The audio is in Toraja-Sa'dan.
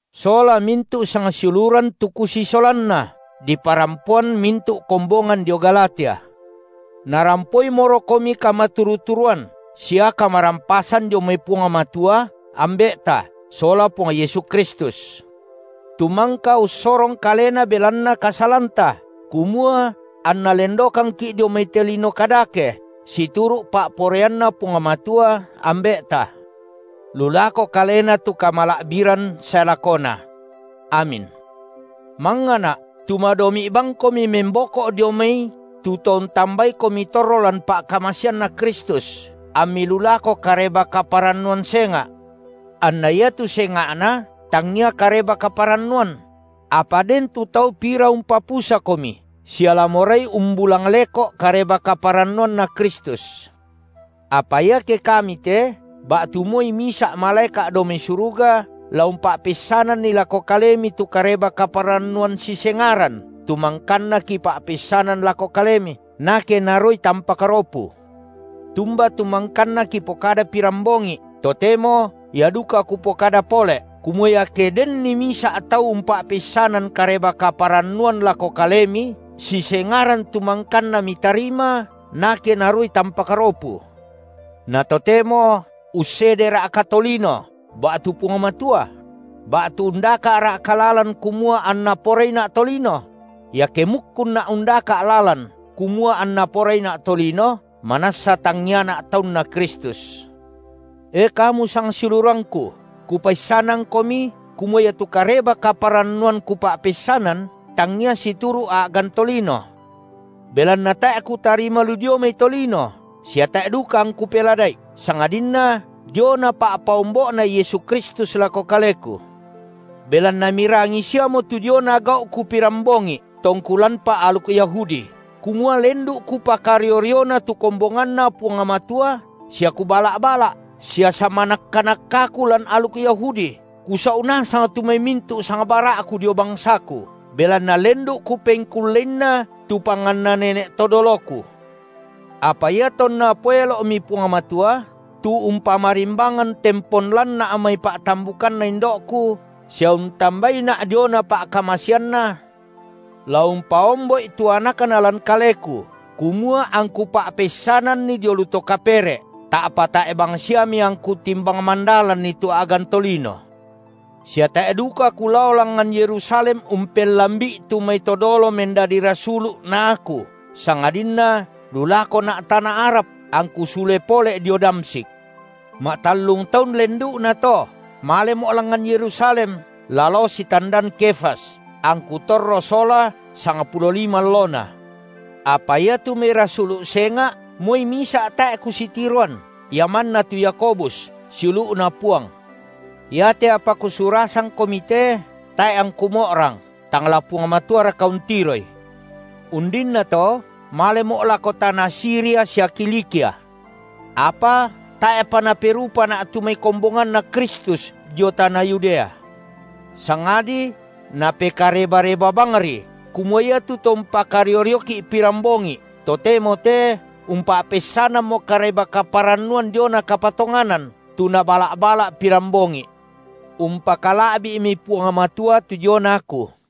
sola mintu’ sangsiuluran tu kusisolanna, diparampoan mintu’ kombongan dio Galatia, narampoimorokomi kamaturu-turuan sia kamarampasan dio mai Puang Matua, Ambe’ta, sola Puang Yesu Kristus, tu mangka ussorong Kalena belanna kasalanta, kumua anna lendokangki’ dio mai te lino kadake, situru’ pa’poraianNa Puang Matua, Ambe’ta. Lu lako Kalena tu kamala’biran sae lakona. Amin. Mangngana’, tu madomi’ bangkomi memboko’ dio mai tu to untambaikomi torro lan pa’kamaseanNa Kristus, ammi lu lako kareba-kaparannuan senga’, anna iatu senga’na tangia Kareba-kaparannuan; apa den tu tau pira umpapusakomi sia la morai umbulang leko’ Kareba-kaparannuanNa Kristus. Apa iake kami te ba’tu moi misa’ malaeka’ dao mai suruga la umpa’peissananni lako kalemi tu Kareba-kaparannuan sisengaran tu mangkanna kipa’peissanan lako kalemi, nake naruai tampak ropu. Tumba tu mangkanna kipokada pirambongi’, totemo ia duka kupokada pole’, kumua iake denni misa’ tau umpa’peissanan Kareba-kaparannuan lako kalemi sisengaran tu mangkanna mitarima, nake naruai tampak ropu. Na totemo ussedera’ka tolino, ba’tu Puang Matua? Ba’tu undaka’ra’ka lalan kumua anna poraina’ tolino? Iake mukkunna’ undaka’ lalan kumua anna poraina’ tolino, manassa tangiana’ taunNa Kristus. E kamu sangsiulurangku, kupaissanangkomi, kumua iatu Kareba-kaparannuan kupa’peissanan, tangia situru’ a’gan tolino. Belanna tae’ kutarima lu dioi mai tolino, sia tae’ duka angku pelada’i, sangadinna diona pa’paombo’Na Yesu Kristus lako kaleku. Belanna mirangi siamo tu diona gau’ku pirambongi’, tongku lanpa aluk Yahudi, kumua lendu’ kupakario-riona tu kombonganNa Puang Matua sia kubala’-bala’, sia samanakka-nakkaku lan aluk Yahudi, kusau’ nasang tu mai mintu’ sangbara’ku dio bangsaku, belanna lendu’ kupengkulleinna tu panganna nene’ to doloku. Apa iatonna poelo’mi Puang Matua tu umpamarimbangan tempon lanna’ mai pa’tambukanna indo’ku, sia untambaina’ diona pa’kamaseanNa, la umpaombo’i tu AnakNa lan kaleku, kumua angku pa’peissananNi dio lu to kapere’, ta’pa tae’ bangsiami angku timbang mandalanni tu a’gan tolino; sia tae’ duka kulao langngan Yerusalem umpellambi’i tu mai to dolo mendadi rasulu’ na aku, sangadinna lu lakona’ tana Arab, angku sule pole’ dio Damsyik. Ma’tallung taun lendu’nato malemo’ langngan Yerusalem, la lao sitandan Kefas, angku torro sola sangpulo lima allona. Apa iatu mai rasulu’ senga’ moi misa’ tae’ kusitiroan, ia manna tu Yakobus, siulu’Na Puang. Iate apa kusurasangkomi te, tae’ angku mo’rang, tang la Puang Matuaraka untiroi. Undinnato malemo’ lako tana Siria sia Kilikia. Apa tae’pa naperupana’ tu mai kombonganNa Kristus dio tana Yudea; sangadi napekareba-reba bangri kumua iatu to umpakario-rioki’ pirambongi’, totemo te umpa’peissanammo Kareba-kaparannuan diona kapatonganan, tu nabala’-bala’ pirambongi’. Umpakala’bi’mi Puang Matua tu diona aku.